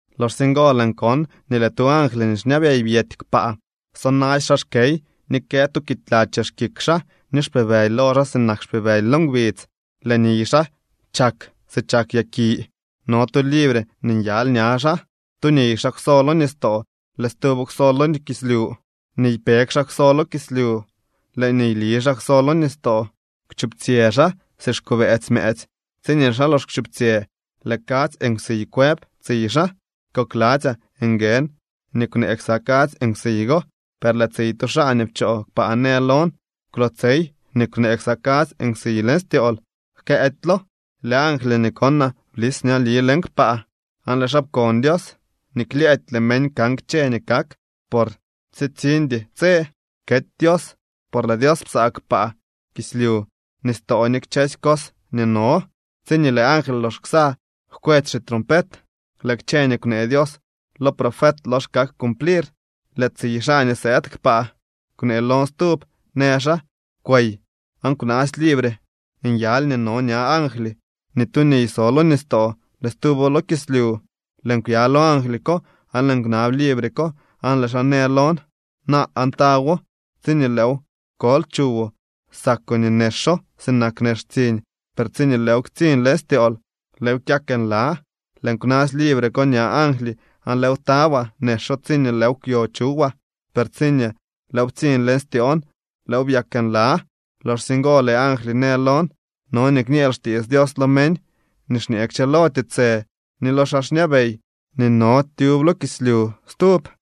Loxsye ngo lëën kon nii lëë tu angly nii xñabey byety kpaa sonasy xaa xkey ni kë tu kiitla chex kik xaa, ni xpibëly lo xaa sinak xpibëly lo ngbidz, lëë niy xaa chak si chak yaki. No tu libre nii nyaly ña xaa. Tu niy xaa kwso lo nistoo, lëë stuwo kwso lo kislyu. Niypeg xaa kwso lo kislyu, lëë niyli xaa kwso lo nistoo. Kwchuptsyë xaa si xkobëëtsy mëëtsy. Tsiñee lëë xaa lox kwchuptsyë lëë kadzy nkwsiy kwëb tsiy xaa. Kokladzyaa nguën nii kwnee ksa kadzy nkwsiy go, per lëë tsiy tu xaa nii pchoo kpaa në lon: —Kwlootsey nii kwnee ksa kadzy nkwsiy leñ styool, jkëëdylo. Lëë angly nii konaa blis ñali leñ kpaa, aan lëë xaa pkon Dios nii klyëëdy lëë meñ kan kchë ni kak por tsitsiñdy tse kety Dios, por lëë Dios psaa kpaa, kislyu, nistoo ni kchësy cos nii no. Tsiñee lëë angly lox ksa jkwetsy xitrompet, lëë kchë nii kwnee Dios lo profet lox kak cumplir. Lëë tsiy xaa nii sëëd kpaa kwnee lon stub, në xaa: —Kwey aan kwnaasy libre nyaly nii no ña angly nii tu niy so lo nistoo lëë stuwo lo kislyu. Lëën kwya lo angly ko aan lëën kwnab libre ko, aan lëë xaa në lon: —Naa aan tawo. Tsiñee lëëw kol chuwoo, sakoo nii nexo sinak nex tsiñ, per tsiñee lëëw ktsiñ leñ styool, lëëw kyak nla. Lëën kwnasy libre ko ña angly aan lëëw tawaa. Nexo tsiñee lëëw kwyo chuwaa, per tsiñee lëëw ptsiñ leñ styoon, lëëw byak nla. Loxsye ngo lëë angly në lon: —No nii kñeel xtiits Dios lo meñ nii xñee kchëlo tiitsë, ni lo xaa xñabey nii no tyub lo kislyu stub.